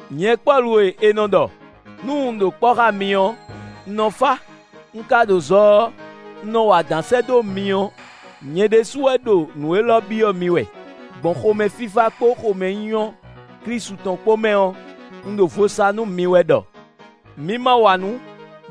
Nyɛ Pɔ́lu e è nɔ ɖɔ, nú un ɖo kpɔ́ xá mi ɔ́, un nɔ fá, un ka ɖo zɔ ɔ́ un nɔ wa adǎn sɛ́ dó mi ɔ́, nyɛ ɖésú wɛ ɖo nǔ élɔ́ byɔ́ mi wɛ; gbɔn xomɛfífá kpó xomɛnyínyɔ́ Klísu tɔn kpó mɛ ɔ́, un ɖo vo sa nú mi wɛ ɖɔ: mi ma wa nǔ,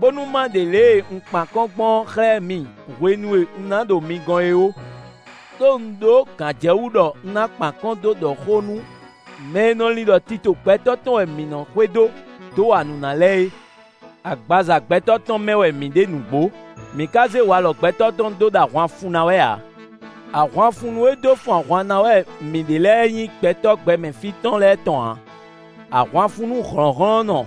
bónú ma ɖe lě e un kpan akɔ́n gbɔn ɔ́ xlɛ́ mi hwenu e un ná ɖo mi gɔ́n é ó; ɖó un ɖó gǎnjɛwú ɖɔ un ná kpan akɔ́n dó ɖɔ xó nú mɛ e nɔ lin ɖɔ tito gbɛtɔ́ tɔn wɛ mǐ nɔ́ xwedó, dó wa nǔ ná lɛ́ɛ é. Agbaza gbɛtɔ́ tɔn mɛ wɛ mǐ ɖe nǔgbó; mǐ ka zé walɔ gbɛtɔ́ tɔn dó ɖo ahwan fun ná wɛ ǎ. Ahwanfunnú e dó fun ahwan ná wɛ mǐ ɖe lɛ́ɛ nyí gbɛtɔ́ gbɛmɛ fí tɔn lɛ́ɛ tɔn ǎ: ahwanfunnú hlɔ̌nhlɔ́nnɔ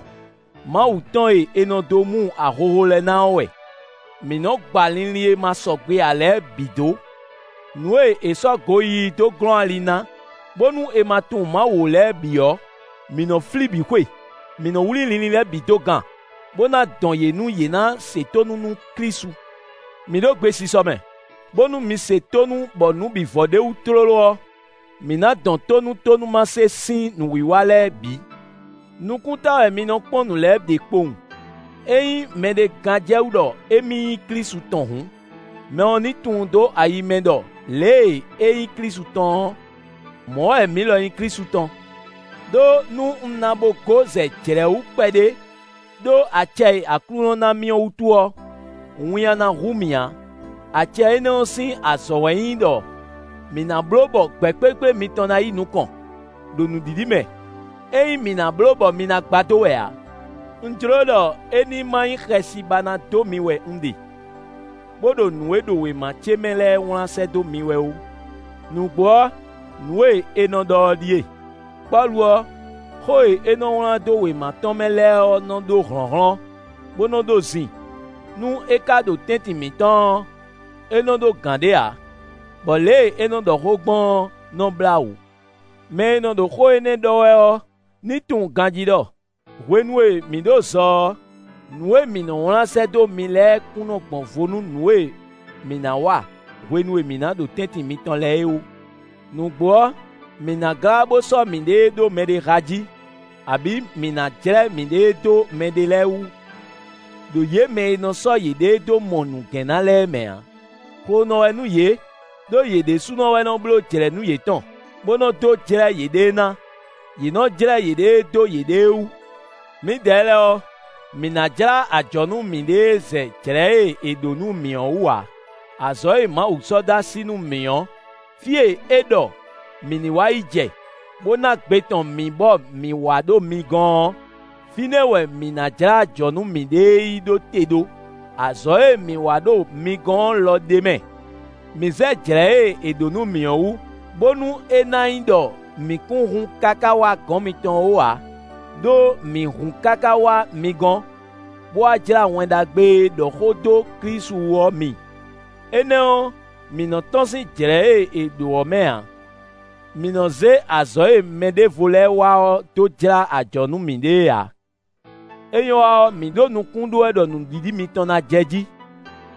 Mawu tɔn e è nɔ dó mu ahohó lɛ́ɛ ná ɔ́ wɛ. Mǐ nɔ́ gba linlin e ma sɔgbe ǎ lɛ́ɛ bǐ dó. Nǔ e è sɔ́ goyíyí dó glɔ́n ali ná, bónú è ma tunwun Mawu ó lɛ́ɛ bǐ ɔ́, mǐ nɔ́ flí bǐ xwe; mǐ nɔ́ wlí linlin lɛ́ɛ bǐ dó gan, bó ná dɔn yě nú yě ná se tónú nú Klísu. Mǐ ɖo gbesisɔ mɛ, bónú mi se tónú bɔ nǔ bǐ vɔ ɖ'é wú tlóló ɔ́, mǐ ná dɔn tó nú tónúmase sín nǔwiwa lɛ́ɛ bǐ. Nukúnta wɛ mi nɔ kpɔ́n nǔ lɛ́ɛ ɖe kpowun. Ényí mɛɖé gán jɛ wú ɖɔ émí nyí Klísu tɔn hǔn, mɛ ɔ́ ní tunwun dó ayi mɛ ɖɔ lě e é nyí Klísu tɔn ɔ́, mɔ̌ wɛ mǐ lɔ nyí Klísu tɔn. Đó nú un na bo gó zɛ jlɛ̌ wú kpɛɖé ɖó acɛ e Aklúnɔ ná mì ɔ́ wútu ɔ́, winnyá ná hu mì ǎ; acɛ énɛ́ ɔ́ sín azɔ̌ wɛ nyí ɖɔ mǐ ná bló bɔ gbɛ̌kplékplé mitɔn ná yi nukɔn ɖo nǔɖiɖi mɛ; é nyí mǐ ná bló bɔ mi ná gbadó wɛ ǎ. Un jló ɖɔ é ní ma nyí xɛsi ba ná dó mi wɛ un ɖe, bó ɖo nǔ e ɖo wěma ce mɛ lɛ́ɛ wlán sɛ́ dó mi wɛ ó. Nǔgbó ɔ́, nǔ e è nɔ ɖɔ ɔ́ ɖíe: “Pɔ́lu ɔ́, xó e é nɔ wlán dó wěma tɔn lɛ́ɛ mɛ ɔ́ nɔ ɖó hlɔ̌nhlɔ́n, bó nɔ ɖó zin; nú é ka ɖo tɛ́ntin mǐtɔn ɔ́, é nɔ ɖó gǎn ɖé ǎ, bɔ lě e é nɔ́ ɖɔ xó gbɔn ɔ́ nɔ́ blá wǔ.” Mɛ e nɔ ɖo xó énɛ́ ɖɔ wɛ ɔ́, ní tunwun ganjí ɖɔ: hwenu e mǐ ɖo zɔ ɔ́, nǔ e mǐ nɔ́ wlán sɛ́ dó mi lɛ́ɛ kún gbɔn vo nú nǔ e mǐ ná wa hwenu e mǐ ná ɖo tɛ́ntin mitɔn lɛ́ɛ é ó. Nǔgbó ɔ́, mǐ ná glá bó sɔ́ mǐɖée ɖó mɛɖé há jí, abǐ mǐ ná jlɛ́ mǐɖée dó mɛɖé lɛ́ɛ wú, ɖo yě mɛ e nɔ sɔ́ yěɖée dó mɔ nǔgɛ́n ná lɛ́ɛ mɛ ǎ. Xlonɔ wɛ nú yě, ɖó yě ɖésúnɔ wɛ nɔ́ bló jlɛ̌nú yětɔn, bó nɔ dó jlɛ́ yěɖée ná; yě nɔ jlɛ́ yěɖée dó yěɖée wú. Mǐdɛɛ lɛ́ɛ ɔ́, mǐ ná jlá ajɔ̌ nú mǐɖée zɛ jlɛ̌ e è ɖǒ nú mǐ ɔ́ wú ǎ; azɔ̌ e Mawu sɔ́ dó así nú mǐ ɔ́, fí e é ɖɔ mǐ ní wá yi jɛ, bó ná gbe tɔn mǐ bɔ mǐ wa ɖo mi gɔ́n ɔ́, fínɛ́ wɛ mǐ ná jlá ajɔ̌ nú mǐɖée yi ɖó te ɖó. Azɔ̌ e mǐ wa ɖo mi gɔ́n ɔ́ lɔ ɖ'é mɛ. Mǐ zɛ jlɛ̌ e è ɖǒ nú mǐ ɔ́ wú, bónú é ná nyí ɖɔ mǐ kún hun káká wá gɔ̌n mitɔn ó ǎ; ɖó mǐ hun káká wá mi gɔ́n, bó wá jlá Wɛn Ɖagbe e ɖɔ xó dó Klísu wú ɔ́ mi. Énɛ́ ɔ́, mǐ nɔ́ tɔ́n sín jlɛ̌ e è ɖǒ ɔ́ mɛ ǎ; mǐ nɔ́ zé azɔ̌ e mɛɖěvo lɛ́ɛ wa ɔ́ dó jlá ajɔ̌ nú mǐɖée ǎ; é nyɔ́ wa ɔ́, mǐ ɖo nukún ɖó wɛ ɖɔ nǔɖiɖi mitɔn ná jɛjí,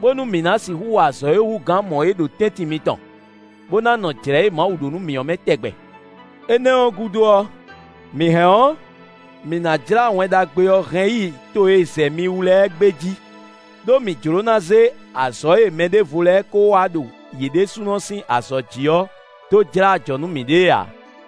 bónú mǐ ná sixú wa azɔ̌ e hú gǎn mɔ̌ é ɖo tɛ́ntin mitɔn, bó ná nɔ jlɛ̌ e Mawu ɖó nú mǐ ɔ́ mɛ tɛgbɛ. Énɛ́ ɔ́ gúdo ɔ́, mǐ hɛn ɔ́, mǐ ná jlá Wɛn Ɖagbe ɔ́ hɛn yi to e zɛ mi wú lɛ́ɛ gbé jí, ɖó mǐ jló ná zé azɔ̌ e mɛɖěvo lɛ́ɛ ko wa ɖo yě ɖésúnɔ sín azɔ̌ jí ɔ́, dó jlá ajɔ̌ nú mǐɖée ǎ.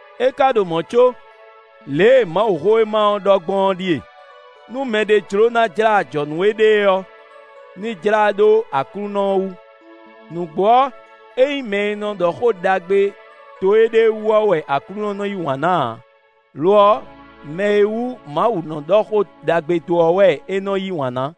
É ka ɖo mɔ̌ có, lě e Mawuxówéma ɔ́ ɖɔ gbɔn ɔ́ ɖíe: “Nú mɛɖé jló ná jlá ajɔ̌ nú éɖée ɔ́, ní jlá ɖó Aklúnɔ ɔ́ wú.” Nǔgbó ɔ́, é nyí mɛ e nɔ ɖɔ xó ɖagbe dó éɖée wú ɔ́ wɛ Aklúnɔ nɔ yí wǎn ná ǎ; lo ɔ́, mɛ e wú Mawu nɔ ɖɔ xó ɖagbe dó ɔ́ wɛ é nɔ yí wǎn ná.